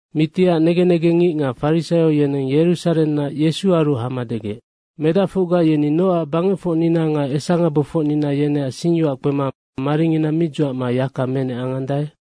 Mitiac negen negengngic nga farisaio yeneng Yerusarennac Yesuaru hama degec, “Medacfocga yeni nocac bangecfocnina nga esangabofocnina yeneac singyoac kpema maringina mi dzuacma yaka menec angandae?”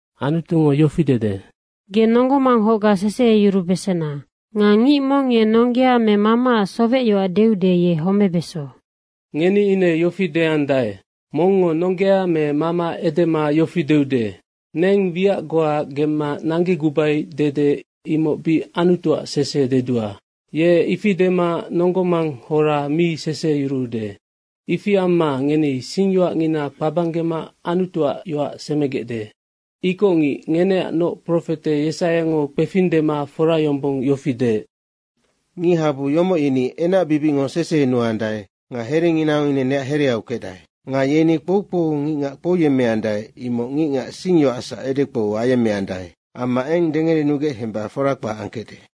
Anutungo yofi dede, “Ge nonggo manghocga seseheyurubesena.” Nga “Ngic mong nonggea me mamaac sowecyoac deude, ye homebeso.” Ngeni ine yofi deandae, “Mongngo nonggea me mama edema yofi deude, ‘Neng wiac goa gemma nanggegubai dede imoc bic Anutuac sese dedua.’ Ye ifi dema nonggo manghora mi seseheyuruude. Ifi amma ngeni singyoacngina kpabanggema Anutuac yoac semegecde. Ikocngic, ngeneacnoc profete Yesaiango kpefing dema fora yombong yofi deec, ‘Ngichabu yomoc yeni enacbibicngo sesehenuandae nga herenginango ine neac hereau kecdae. Nga yeni kpoukpou ngicngac kpouyemmeandae imoc ngicac singyoacsac edekpou ayemmeandae amma eng dengerenugec hemba fora kpac angkecde.’”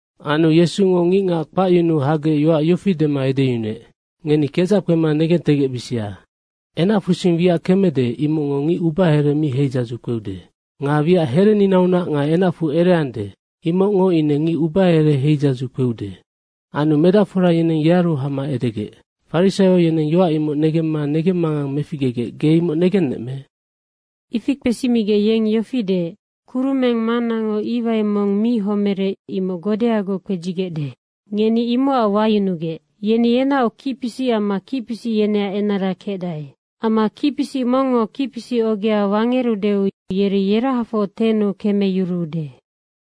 Anu Yesungo ngicngac kpacyunuu hagec yoac yofi dema edeyunuec, “Ngeni kedzac kpema negentegecbisia. Enacfusing wiac kemede, imocngo ngic ubahere mi heidzadzu kpeude. Nga wiac hereninaunac nga enacfu ereande, imocngo ine ngic ubahere heidzadzu kpeude.” Anu medacfora yeneng yearu hama edegec, “Farisaio yeneng yoac imoc negemma negemmangang meficgegec, ge imoc negennec me?” Ifi kpesimigec yeng yofi deec, “Kurumeng Mannango iwai mong mi homerec, imoc godeagoc kpedzigecde. Ngeni imocac wayunugec. Yeni yenaoc kicpisic amma kicpisic yeneac enara kecdae. Amma kicpisic mongngo kicpisic ogea wangerudeu, yeri yerahafoc tennu kemeyuruude.”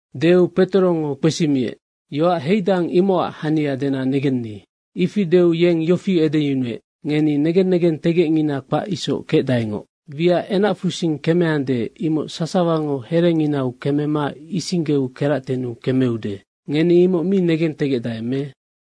Deu Petorongo kpesimiec, “Yoac heidang, imocac hania dena negenni.” Ifi deu yeng yofi edeyunuec, “Ngeni negen negentegecngina kpac isoc kecdaengoc. Wiac enacfusing kemeande, imoc sasawango herenginau kemema isinggeu keractennu kemeude. Ngeni imoc mi negentegecdae me?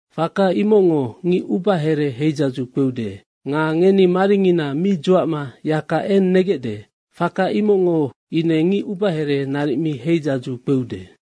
Faka imocngo ngic ubahere heidzadzu kpeude. Nga ngeni maringina mi dzuacma yaka eng negecde, faka imocngo ine ngic ubahere naric mi heidzadzu kpeude.”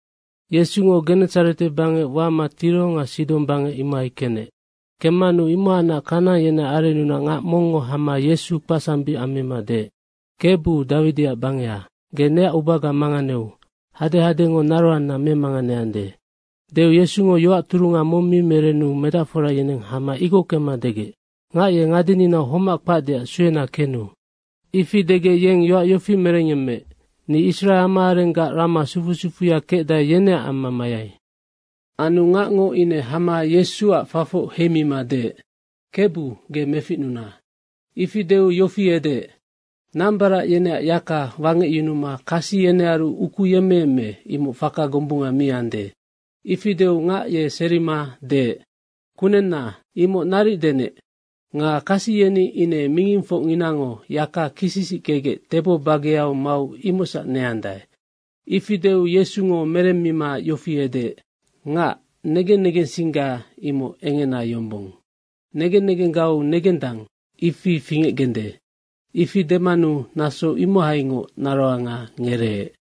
Yesungo Genesarete bangec wama Tiro nga Sidong bangec, imohai kenec. Kemmanu imohacnac Kanaang yeneac arennunac ngac mongngo hama Yesu kpacsambic ammima deec, “Kebu, Dawidiac bangeha, ge neac ubaga manganeu, hadehadengo naroanna memanganeande.” Deu Yesungo yoac turunga mong mi merenu medacfora yeneng hama igockema degec, “Ngac ye ngadeninau homac kpacdeac suena kenu.” Ifi degec, yeng yoac yofi merenec, “Ni Israe amaarenggac rama sufu sufuya kecdae, yeneac amma mayai.” Anu ngacngo ine hama Yesuac fafoc heimima deec, “Kebu, ge meficnuna.” Ifi deu yofi edeec, “Nambarac yeneac yaka wangecyunuma kasi yenearu ukuyemmeyemme, imoc faka gombunga mi ande.” Ifi deu ngac ye serima deec, “Kunenna, imoc naric denec. Nga kasi yeni ine mingingfocnginango yaka kisisickegec tebo bageau mau imocsac neandae.” Ifi deu Yesungo meremma ngac yofi edeec, “Ngac, negen negensingga imoc engena yombong. Negen negenggau negendang, ifi fingecgende.” Ifi demanu naso imohaingoc naroanga ngereec.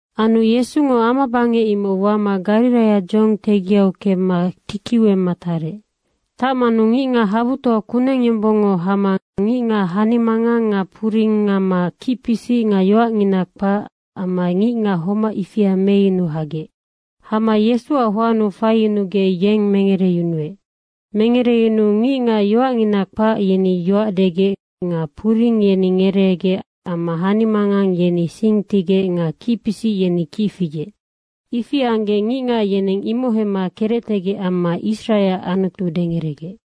Anu Yesungo amabangec, imoc wama Gariraia dzohong tegiau kemma tikiu emma ihai tarec. Tacmanu ngicngac habutoa kuneng yombong hama ngicngac hanimangang nga puring amma kicpisic nga yoacngina kpac amma ngicngac homac ifia meyunuma hagec. Hama Yesuac hoannu faiyunugec yeng mengereyunuec. Mengereyunuu ngicngac yoacngina kpac, yeni yoac degec nga puring yeni ngereegec amma hanimangang yeni sing tigec nga kicpisic yeni kic figec. Ifi anggec ngicngac yeneng imoc hemma kerectegec amma Israeac Anutu dengeregec.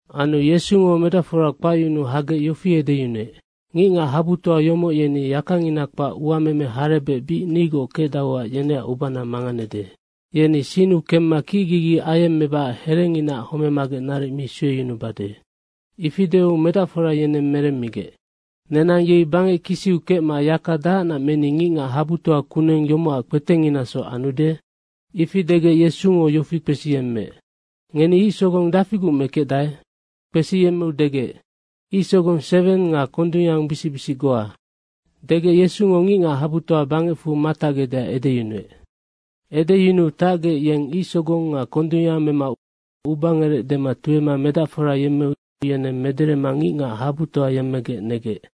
Anu Yesungo medacfora kpacyunuu hagec yofi edeyunuec, “Ngicngac habutoa yomoc yeni yakangina kpac uameme harebec bic nigoc kecdauac yeneac ubana manganede. Yeni sinnu kemma kicgigi ayemmebacac herenginaac homemagec naric mi sueyunubade.” Ifi deu medacfora yeneng meremmigec, “Nenang yei bangec kisiu kecma yaka dahacnac meni ngicngac habutoa kuneng yomocac kpetenginasoc anude?” Ifi degec Yesungo yofi kpesiyemmeec, “Ngeni ic sogong dafiguc mekecdae?” Kpesiyemmeu degec, “Ic sogong seweng nga kondungyangbisic bisic goa.” Degec Yesungo ngicngac habutoa bangecfu matacgecdeac edeyunuec. Edeyunuu tacgec, yeng ic sogong nga kondungyang mema ubangerec dema tuema medacfora yemmeu yeneng mederema ngicngac habutoa yemmegec negec.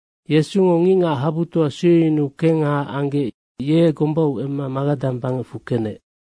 Yesungo ngicngac habutoa sueyunu kengha anggec ye gombau emma Magadang bangecfu kenec.